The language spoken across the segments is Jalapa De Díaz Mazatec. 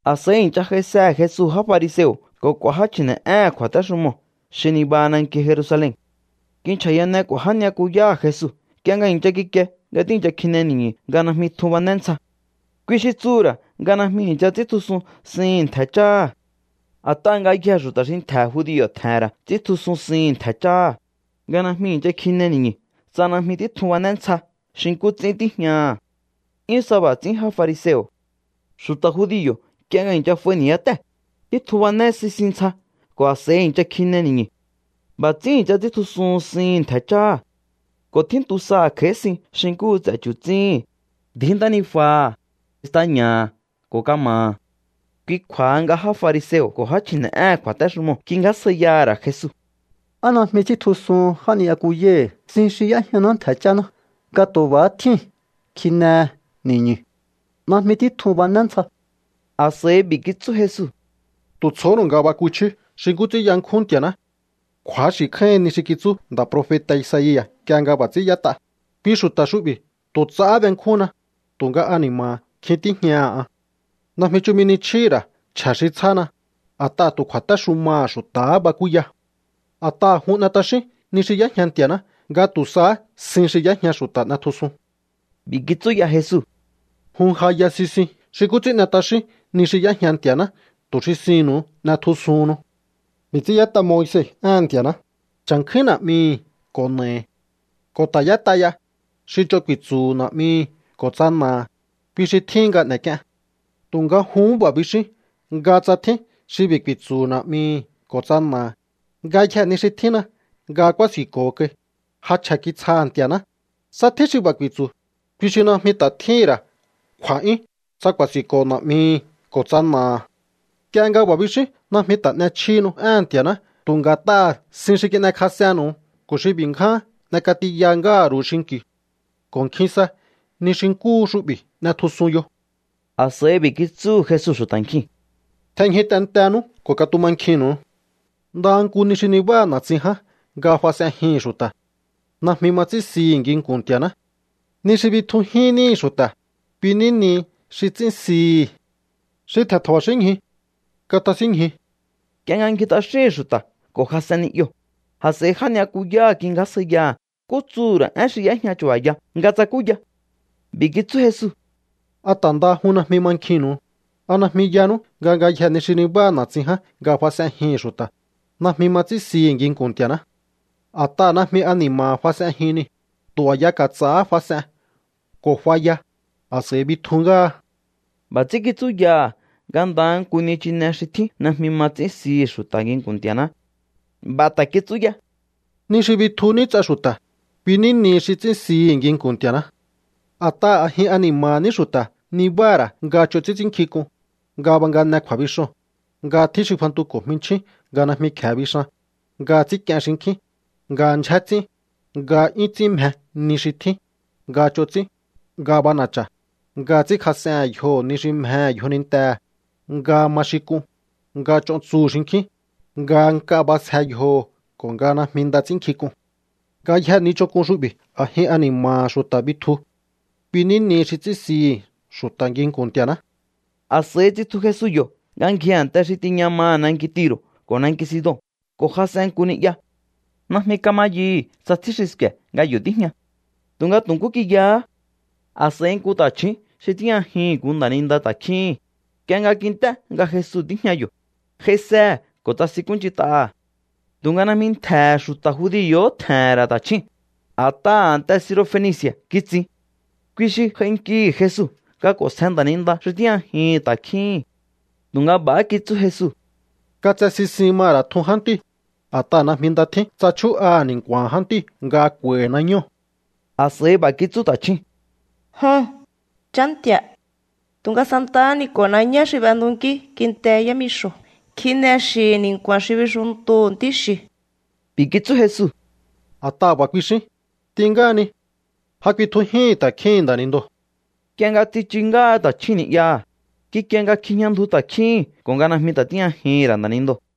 A̱s'a̱i i̱ncha j'aisehe̱ Jesu já fariseo̱ ko̱ k'u̱a̱ já chji̱ne̱'éhe̱n kju̱a̱téxumoo̱ xi nibaha nanki Jerusalen. Kinchja̱yane k'u̱a̱ já ni'yakuyáha̱ Jesu nk'ie nga i̱ncha kikie nga tíi̱ncha kjine ni̱ñu̱ nga najmi tjun bané ntsja. Kui xi tsuhu̱ ra̱ nga najmi i̱ncha ts'íntjusun sihi̱n ntje̱ cháha̱. A̱t'aha̱ ngayjee̱ xu̱ta̱ xi ntje̱ judio̱ tje̱he̱n ra̱ ts'íntjusun sihi̱n ntje̱ cháha̱, nga najmi i̱ncha kjine ni̱ñu̱ tsa najmi títjun bané ntsja xi nkú ts'ín tíjñaha̱. 'Yún sa b'a̱ ts'ín já fariseo̱. Xu̱ta̱ judio̱ nk'ie nga i̱ncha f'aihi ni̱yátée̱, títjun bané sisin ntsja ko̱ a̱s'a̱i i̱ncha kjine ni̱ñu̱. B'a̱ ts'ín i̱ncha ts'íntjusuhun sihi̱n ntje̱ cháha̱. Ko̱ tjíntu saha̱ kj'a̱i̱hí sin xi nkúhu ts'e̱ chu̱tsíhi̱n, ndji̱í ntánijuaha̱, staña̱ha̱ ko̱ kama̱ha̱. Kui kju̱a̱ha nga já fariseo̱ ko̱ já chji̱ne̱'éhe̱n kju̱a̱téxumoo̱ kingjásjaiyaha̱ ra̱ Jesu: —¿Á najmi ts'íntjusuhun já ni'yakuyáhi̱ sin xi y'éjñaná ntje̱ cháná, nga tu̱ b'a̱há tjíu̱n kjinehe ni̱ñu̱? Najmi títjun bané ntsja. A̱s'a̱ b'i̱ kitsú Jesu: —¡Tu̱ tsjohónu̱u nga bakuchíú xi nkú ts'ín yankjún Nti̱a̱ná! Kju̱axi̱ kjáíhin ni xi kitsú nda̱ profeta̱ Isaia̱ nk'ie nga b'a̱ ts'ín y'ét'a: Kui xu̱ta̱ xu'bi̱ tu̱ ts'ahá benkjúnna, tu̱nga ani̱ma̱ha̱ kjin tíjñaha̱ an. Najmi chumi ni chjíhi̱ ra̱ chje̱ xi tsjána, a̱t'aha̱ tu̱ kju̱a̱téxumaha̱ xu̱ta̱há bakúya. A̱t'aha̱ jun n'e t'axíún ni xi y'éjña Nti̱a̱ná nga tu̱ sahá sin xi y'éjña xu̱ta̱ n'etjusun. B'i̱ kitsú ya Jesu: —Jun ja ya sisiun xi nkú ts'ín n'e t'axíún ni xi y'éjña Nti̱a̱ná tu̱ xi sinnu̱u n'etjusuhunnu. B'i̱ ts'ín y'ét'a Moise éhe̱n Nti̱a̱ná: “Cha̱nkjúín na̱'mihi̱ ko̱ na̱ahi̱.” Ko̱ ta̱ y'ét'a ya: “Xi ch'on ku̱i̱tsu̱hu̱ na̱'mihi̱ ko̱ tsa na̱aha̱, kui xi tjíhin nga n'e̱k'ien.” ’Tu̱nga juhún b'a̱ bixíún nga tsa tjín xi b'i̱ ku̱i̱tsu̱hu̱ na̱'mihi̱ ko̱ tsa na̱aha̱: “Ngayjee̱ ni xi tjínna nga kúási̱nko̱ho kai, ja chje̱ kitsjaha̱ Nti̱a̱ná”, tsa tjín xi b'a̱ ku̱i̱tsu̱, kui xi najmi ta̱ tjíhín ra̱ kju̱a̱'yún tsa ku̱a̱si̱nko̱ na̱'mihi̱ ko̱ tsa na̱aha̱. Nk'ie nga b'a̱ bixíún najmi ta̱ n'echjíhinu éhe̱n Nti̱a̱ná tu̱ nga̱t'aha̱ sin xi kin'ekjas'ennu̱u ko̱ xi b'i̱ ngján n'ek'atiya ngáha̱ ru̱u xinki̱u. Ko̱ nkjin sa ni xi nkúhu xu'bi̱ n'etjusun yo. A̱s'a̱i b'i̱ kitsúhu̱ Jesu xu̱ta̱ nkjiu̱n: —Tjenñju tentenú ko̱ katumankjinnu̱u. Ndaha nku ni xi nibáha na̱tsin ján nga fas'enjihi̱n xu̱ta̱, najmi ma ts'ín sihi̱ nginku̱n Nti̱a̱ná. Ni xi bitjujín níhi̱ xu̱ta̱, kui ní nihi xi ts'ín sihi̱. Xi tje̱n tja̱ba̱xínñju, katasínñju. Nk'ie nga ngji t'axíhi̱n xu̱ta̱ ko̱ jas'en ni'yoo̱, a̱s'a̱i já ni'yakuyáha̱ kingjásjaiyaha̱ nkú tsuhu̱ ra̱ én xi yéjña chu̱ba̱ya nga tsakúya. B'i̱ kitsú Jesu: —¿A ta̱ ndaha jun najmi mankjinnu̱u? ¿A najmi yanú nga ngayjee̱ ni xi nibáha na̱tsin ján nga fas'enjihi̱n xu̱ta̱, najmi ma ts'ín sihi̱ nginku̱n Nti̱a̱ná? A̱t'aha̱ najmi ani̱ma̱ha̱ fas'enjin niu̱. Tu̱ a̱ya ka̱ts'a̱há fas'en ko̱ f'aya, a̱s'a̱i bitju ngáha. B'a̱ ts'ín kitsúyaha nga ndaha nku nichine xi tjín najmi ma ts'ín sihi̱ xu̱ta̱ nginku̱n Nti̱a̱ná. B'a̱ ta̱ kitsú ya: —Ni xi bitju ní ts'a xu̱ta̱, kui ní nihi xi ts'ín sihi̱ nginku̱n Nti̱a̱ná. A̱t'aha̱ a̱jin ani̱ma̱ha̱ ní xu̱ta̱ nibáha̱ ra̱ nga ch'on ts'ín ts'ínnkjink'un, nga bangane kju̱a̱bixoo̱n, nga tjín xi fantuko̱ jminchjín nga najmi kje̱e bixan, nga ts'ínk'ien xinkjín, nga ndyjé ts'ín, nga 'yún ts'ín mje ni xi tjín, nga ch'on ts'ín, nga b'ana̱cha̱, nga ts'ínkjas'ehe̱n yjoho̱ ni xi mjehe̱ yjonintehe̱, nga ma xin k'un, nga ch'on tsuhu̱ xinkjín, nga nk'a b'asje yjoho̱ ko̱ nga najmi nda ts'ínnkjink'un. Ngayjee̱ ni ch'onk'un xu'bi̱ a̱jin ani̱ma̱ha̱ xu̱ta̱ bitju. Kui ní nihi xi ts'ín sihi̱ xu̱ta̱ nginku̱n Nti̱a̱ná. A̱s'a̱i tsitju Jesu yo̱ nga ngji a̱nte xi tiña maha̱ nanki Tiro̱ ko̱ nanki Sidon ko̱ jas'en nku ni'ya. Najmi kama yuhu̱ tsa tjín xi sku̱e̱ nga yo̱ tíjña. Tu̱nga tu̱ nkú kiyahá. A̱s'a̱i nku ta̱chju̱ún xi tíjñajihi̱n nku nda̱ninda ta̱kjíhi̱n, nk'ie nga kint'é nga Jesu tíjña yo̱, j'aisehe̱ ko̱ tsasinkúnch'int'aha̱. Tu̱nga najmi ntje̱he̱ xu̱ta̱ judio̱hó tje̱he̱n ra̱ ta̱chjúu̱n, a̱t'aha̱ a̱nte Sirofenici̱a̱ kitsin. Kui xi j'ainkihi̱ Jesu nga k'o̱nsje nda̱ninda xi tíjñajihi̱n ta̱kjíhín. Tu̱nga b'a̱há kitsú Jesu: —Katse sisin ma ra̱ tjun jántíu̱. A̱t'aha̱ najmi nda tjín tsa chjú'aha̱ ni̱nku̱a̱ha̱n jántíu̱ nga kj'u̱a̱i̱hi̱ nañóo̱. A̱s'a̱i b'a̱ kitsú ta̱chjúu̱n: —Joho̱n, Chá Nti̱a̱, tu̱nga santahá ni ko̱ nañá xi b'entunkí kinte yámixo̱ kjine xi̱hi̱ ni̱nku̱a̱n xi bixuntuhu̱ ntí xi̱u̱. B'i̱ kitsú Jesu: —A̱t'aha̱ b'a̱ kuixín, t'in ngáhani. Ja kuitjujíhi̱n ta̱kjíhi̱n nda̱nindoo̱. Nk'ie nga tsichu ngáha ta̱chjúu̱n ni'yaha̱, kikie nga kjijña ndju ta̱kjíhi̱n ko̱ nga ja najmi ta̱ tíjñajihi̱n ra̱ nda̱nindoo̱.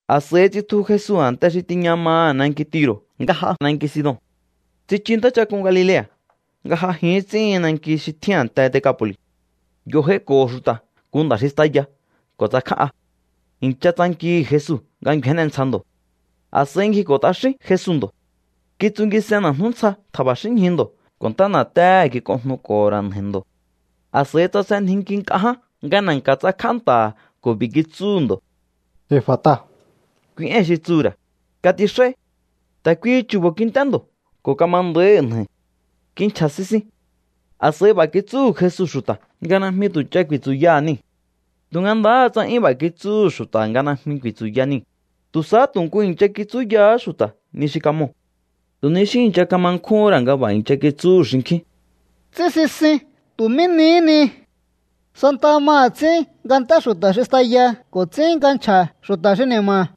A̱s'a̱i tsitju Jesu a̱nte xi tiña maha̱ nanki Tiro̱ nga j'a nanki Sidon. Tsichu ntáchak'un Galilea̱ nga j'ajin ts'íhin nanki xi tjín a̱nte Decapo̱li̱. Yo̱ j'aiko̱ho̱ xu̱ta̱ nku nda̱ xi staya ko̱ tsakján'a. I̱ncha tsankihi̱ Jesu nga ngju̱énne ntsja ndo̱. A̱s'a̱i ngjiko̱ t'axín Jesu ndo̱. Kitsungis'en na̱jnú ntsja tja̱ba̱xínñju ndo̱ ko̱ ntá na̱téhe̱ kik'onjnuko̱ho̱ ra̱ nja̱i̱ ndo̱. A̱s'a̱i tsasenjinki nk'a ján nga na̱nka̱ tsakj'á nta̱ha̱ ko̱ b'i̱ kitsúhu̱ ndo̱: —¡Efata! —Kui éi̱n xi tsuhu̱ ra̱: ¡Katix'áí! Ta̱ kuihi chu̱bo̱ kint'é ndo̱ ko̱ kama nda̱íhi̱ nja̱i̱. Kinchja̱ sisin. A̱s'a̱i b'a̱ kitsúhu̱ Jesu xu̱ta̱ nga najmi tu̱ ch'a ku̱i̱tsu̱yaha̱ niu̱. Tu̱nga ndahá tsa 'yún b'a̱ kitsúhu̱ xu̱ta̱ nga najmi ku̱i̱tsu̱ya niu̱, tu̱ sahá tu̱ nku i̱ncha kitsúyahá xu̱ta̱ ni xi kamoo̱. Tu̱ ni xí i̱ncha kama nkjúhún ra̱ nga b'a̱ i̱ncha kitsúhu̱ xinkjín: —Ts'ín sisin tu̱ mí nihí ni. Santaha maha̱ ts'ín nga nt'é xu̱ta̱ xi staya ko̱ ts'ín nga nchja̱ xu̱ta̱ xi ni̱ma̱.